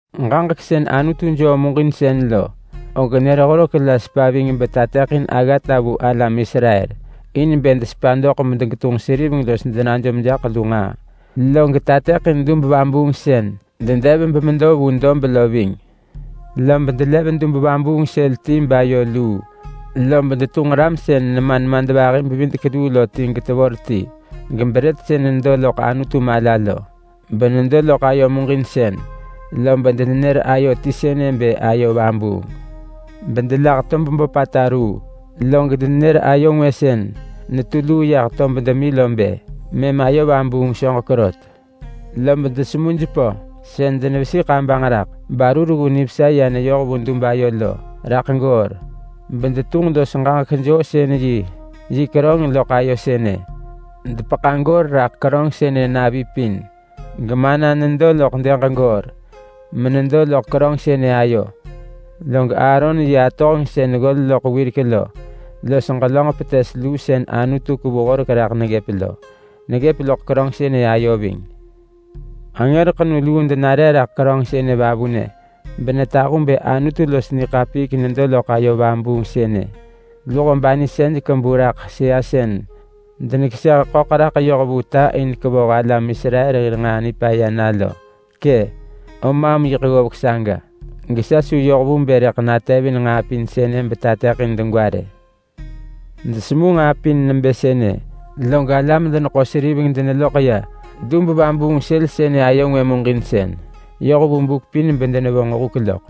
Ġaġek sën Anutu joo muġinsën lo, og nër horek la sepa ving betateḳin aggata vu alam Israel in bë desepa doḳ medegetunġ seriveng los denajom jaḳ lu nġaa. Log tateḳin dub-vabuung sën dedev bemedo vu dob lo ving. Lob delev dub-vabuung sël ti bayo luu. Lob detunġ ram sën nema nemadvahi-bevidek-luu lo ti getevor ti, gebrët sën nedo loḳ Anutu mala lo, benedo loḳ ayo muġinsën. Lob denenër ayo ti sënë bë ayo vabuung. Bedelah tob böpata ruu, log denenër ayo ngwë sën netu luu yah tob demi lo bë mëm ayo vabuung soġek rot. Lob desemu jepö sën denevesi kabanġ raḳ baru reggu nivesa ya neyoh vu dub ayo lo raḳ goor. Bedetunġ los ġaġek-joosën-yi yi keröng loḳ ayo sënë. Depeḳa goor raḳ keröng sënë navi pin, gemana nedo loḳ dëg goor menedo loḳ keröng sënë ayo. Log Aaron yi atohenġ sën ggol loḳ wirek lo los ġelönġ petes luu sën Anutu kevu Horek raḳ neggëp lo, neggëp loḳ keröng sënë ayo ving. Angër ḳenu luu denare raḳ keröng sënë vavunë, benetahu bë Anutu los niḳapiik nedo loḳ ayo vabuung sënë. Luho banisej kebu raḳ sëa sën denekeseh ḳöḳ raḳ yoh vu ta in kevoh alam Israel hir nġaa nipaya na lo. Kë! Om maam yiḳ ggovek saga, gesa su yoh vu bë rëḳ natevin nġaa pin sënë betateḳin degwa rë. Desemu nġaa pin nebë sënë, log alam-deneḳo-seriveng deneloḳ ya dub-vabuung sël sënë ayo ngwë muġinsën yoh vu buk pin bedenevonġ huk loḳ.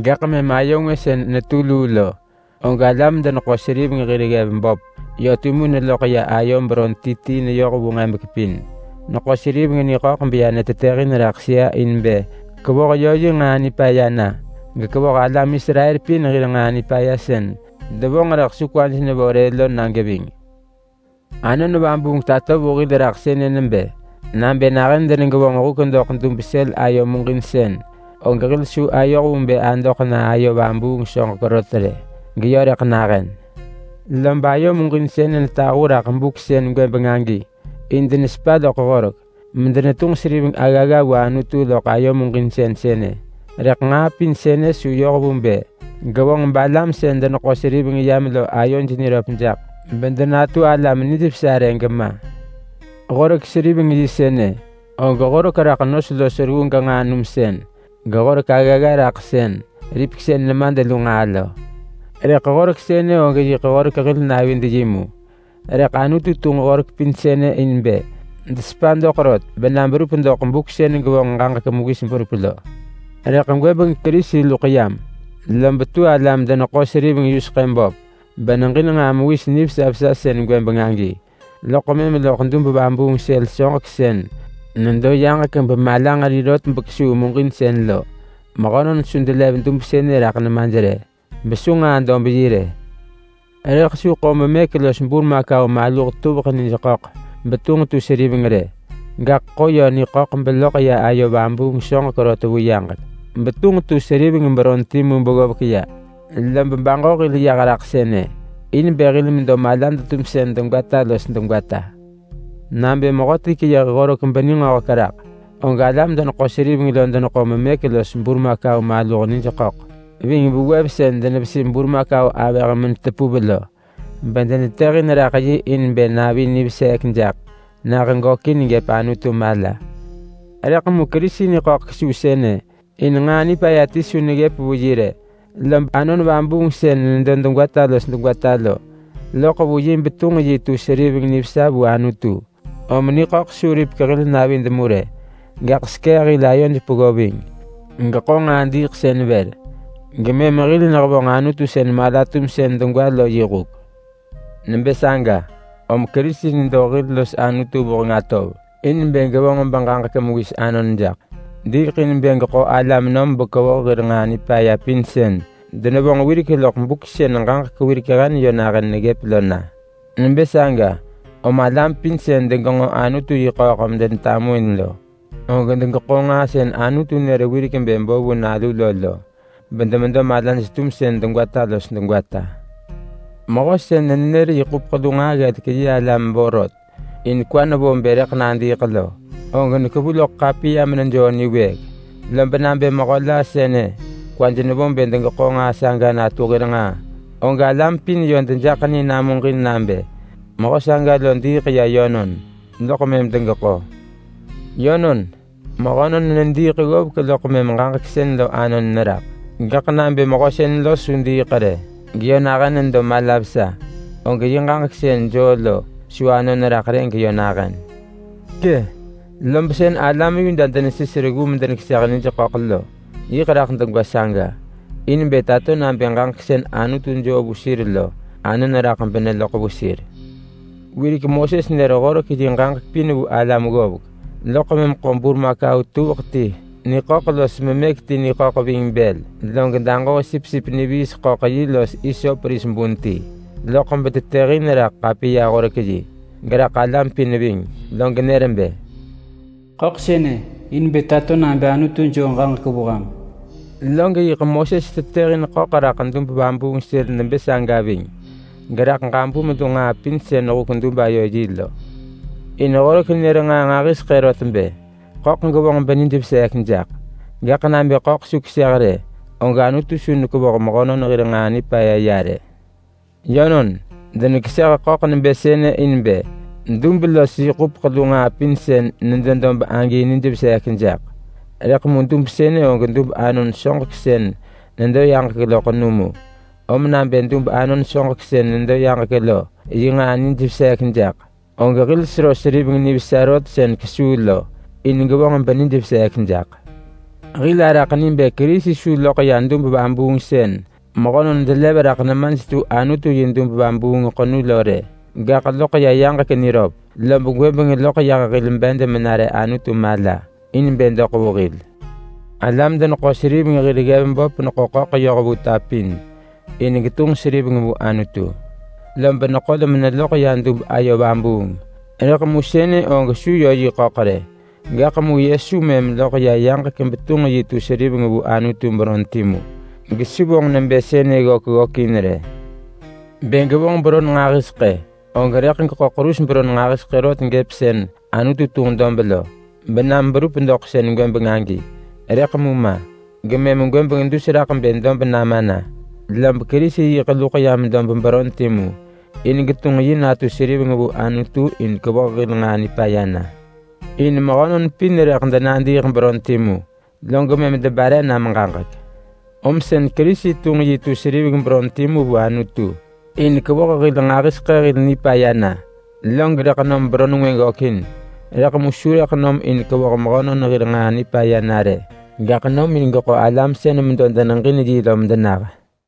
Gaḳ mëm ayo ngwë sën netu luu lo, og alam-deneḳo-seriveng hir ggev böp yö timu neloḳ ya ayo beron ti ti neyoh vu nġebek pin. Neḳo seriveng niḳöḳ beya netetëhin raḳ sëa in bë kevoh yö yi nġaa nipaya na, gekevoh alam Israel pin hir nġaa nipaya sën devonġ rëḳ su kwaj nevo rë lo na geving. Anon Vabuung tato vu hil raḳ sënë nebë: Nabë nahën denegevonġ huk doḳ dub sël ayo muġinsën, og hil su ayoh vu bë adoḳ na ayo vabuung soġek rot rë geyö rëḳ nahën. Lob ayo muġinsën netahu raḳ buk sën gwëbeng agi, in denesepa loḳ Horek medenetunġ seriveng aggagga vu Anutu loḳ ayo muġinsën sënë. Rëḳ nġaa pin sënë su yoh vu bë gevonġ balam sën deneḳo seriveng yam lo ayoj niröp jaḳ bedenatu alam nijvesa rë gema. Horek seriveng-yi sënë, og horek raḳ nos los reggu genġaa numsën, gehorek aggagga raḳ sën ripeksën nemad lu nġaa lo. Rëḳ horek sënë og yiḳ horek hil navid-yi mu. Rëḳ Anutu tunġ horek pin sënë in bë desepa doḳ rot bena berup doḳ buk sën gevonġ ġaġek mewis berup lo. Rëḳ gwëbeng Kerisi luḳ yam, lob tu alam-deneḳo-seriveng yuseḳë böp beneġin nġaa mewis nivesa vesa sën gwëbeng agi. Loḳ mëm loḳ ya dub-vabuung sël soġek sën nedo yaġek bemalanġeri rot bekesuu muġinsën lo. Mehönon su delev dub sënë raḳ nemaj rë, besu nġaa-dob-yi rë. Rëḳ su ḳo memëk los burmakau maluh tuveḳ nij ḳöḳ betunġ tu seriveng rë. Gaḳ ḳo yö niḳöḳ beloḳ ya ayo vabuung soġek rot vu yaġek betunġ tu seriveng beron timu beggovek ya. Lob baġo hil yah raḳ sënë in bë hil medo malad-tumsën degwata los degwata. Nabë mehöti keyëh Horek beningöhek raḳ, og alam-deneḳo-seriveng lo deneḳo memëk los burmakau maluh nij ḳöḳ ving vewev sën denevesi burmakau avëh menetepuv lo, bedenetetëhin raḳ yi in bë navi niveseek jaḳ nah gökin gëp Anutu mala. Rëḳ mu Kerisi niḳöḳ kesuu sënë in nġaa nipaya ti su neggëp vu yi rë. Lob Anon Vabuung sën nedo degwata los degwata lo loḳ vu yi betunġ yi tu seriveng nivesa vu Anutu. Om niḳöḳ su ripek hil navid mu rë. Gaḳ sekee hil ayod peggo ving geḳo nġaa diiḳsën vër, gemëm hil nehevonġ Anutu sën mala-tumsën degwa lo yi huk. Nebë saga, om Kerisi nedo hil los Anutu vuheng atov in bë gevonġ beġaġek mewis anon jaḳ. Diiḳ in bë geḳo alam nom bekevoh hir nġaa nipaya pin sën denevonġ wirek loḳ buk sën ġaġek wirek hen yö nahën neggëp lo na. Nebë saga, om alam pin sën degenġo Anutu yi ḳööḳ medetamuin lo, og degeḳo nġaa sën Anutu nër wirek bë bo vu nalu lo lo, bedemedo malaj-tumsën degwata los degwata. Mehö sën nenër yi ḳupeḳ lu nġaa ggelek yi alam vorot in kwa nevo bë rëḳ nadiiḳ lo, og nekevu loḳ ḳapiya menejoo niwëëk. Lob nabë mehö la sënë kwaj nevo bë degeḳo nġaa saga natu hir nġaa, og alam pin yö dejaḳ ni namuġin nabë mehö saga lo diiḳ ya yönon, loḳ mëm degeḳo. Yönon, mehönon nediiḳ ggovek loḳ mëm ġaġek sën lo anon neraḳ. Gaḳ nabë mehö sën lo su diiḳ rë geyö nahën nedo mala vesa, og yi ġaġek sën joo lo su anon raḳ rë geyö nahën. Kë! Lob sën alam Yuda denesis reggu medenekeseh nij ḳöḳ lo, yiḳ raḳ degwa saga in bë tato nabë ġaġek sën Anutu joo vu sir lo anon raḳ beneloḳ vu sir. Wirek Moses nër Horek yi ġaġek pin vu alam ggovek, loḳ mëm ḳo burmakau tuveḳ ti niḳöḳ los memëk ti niḳöḳ ving bël, log daġoo sipsip niviis ḳöḳ los vos ti nebë bigbig ris loḳ betetëhin raḳ ḳapiya-horek-yi, geraḳ alam pin ving. Log nër bë, “Ḳöḳ sënë in bë tato nabë Anutu joo ġaġek vu ham.” Log yiḳ Moses tetëhin ḳöḳ raḳ dub-vabuung sël nebë saga ving geraḳ ġabum lu nġaa pin sën huk-dub-ayo-yi lo. In Horek nër nġaa nġahiseḳë rot bë ḳöḳ gevonġ benij veseek jaḳ, gaḳ nabë ḳöḳ su keseh rë, og Anutu su nekevoh mehönon hir nġaa nipaya ya rë. Yönon, denekeseh ḳöḳ nebë sënë in bë dub los yi ḳupeḳ lu nġaa pin sën nedo dob agi nijveseek jaḳ. Rëḳ mu dub sënë og dub anon soġek sën nedo yaġek lo ḳenu mu. Om nabë dub anon soġek sën nedo yaġek lo yi nġaa nijveseek jaḳ, og hil sero seriveng nivesa rot sën kesuu lo in gevonġ benijveseek jaḳ. Hil araḳ ni bë Kerisi su loḳ ya dub-vabuung sën mehönon delev raḳ nemaj tu Anutu yi dub-vabuung ḳenu lo rë, gaḳ loḳ ya yaġek niröp. Lob gwëbeng loḳ yah hil bed menare Anutu mala in bë doḳ vu hil. Alam-deneḳo-seriveng hir ggev böp neḳo ḳöḳ yoh vu ta pin in bë getunġ natu seriveng vu Anutu, lob neḳol meneloḳ ya dub ayo vabuung. Rëḳ sënë og su yö niḳöḳ rë. Rëḳ mu Yesu loḳ ya yaġek betunġ yi tu seriveng vu Anutu beron timu, gesu vonġ nebë sënë ggök ggökin rë. Bë gevonġ beron nġahiseḳë, og rëḳ geḳo ḳerus beron nġahiseḳë rot gëp sën Anutu tunġ dob lo benam berup doḳ sën gwëbeng agi. Rëḳ mu ma. Gemëm gwëbeng dus raḳ bë dob nama na, lob Kerisi yiḳ luḳ yam dob beron timu in bë getunġ yi natu seriveng vu Anutu in kevoh hil nġaa nipaya na. In mehönon pin yiḳ denadiiḳ beron timu, log mëm debare nam ġaġek. Om sën Kerisi tunġ yi tu seriveng beron timu vu Anutu in bë kevoh hil nġahiseḳë hil nġaa nipaya na. Log rëḳ nom beron ngwë gökin, rëḳ mu su rëḳ nom in kevoh mehönon hir nġaa nipaya na rë. Gaḳ nom in geḳo alam sën medo deneġin yi lo medenah.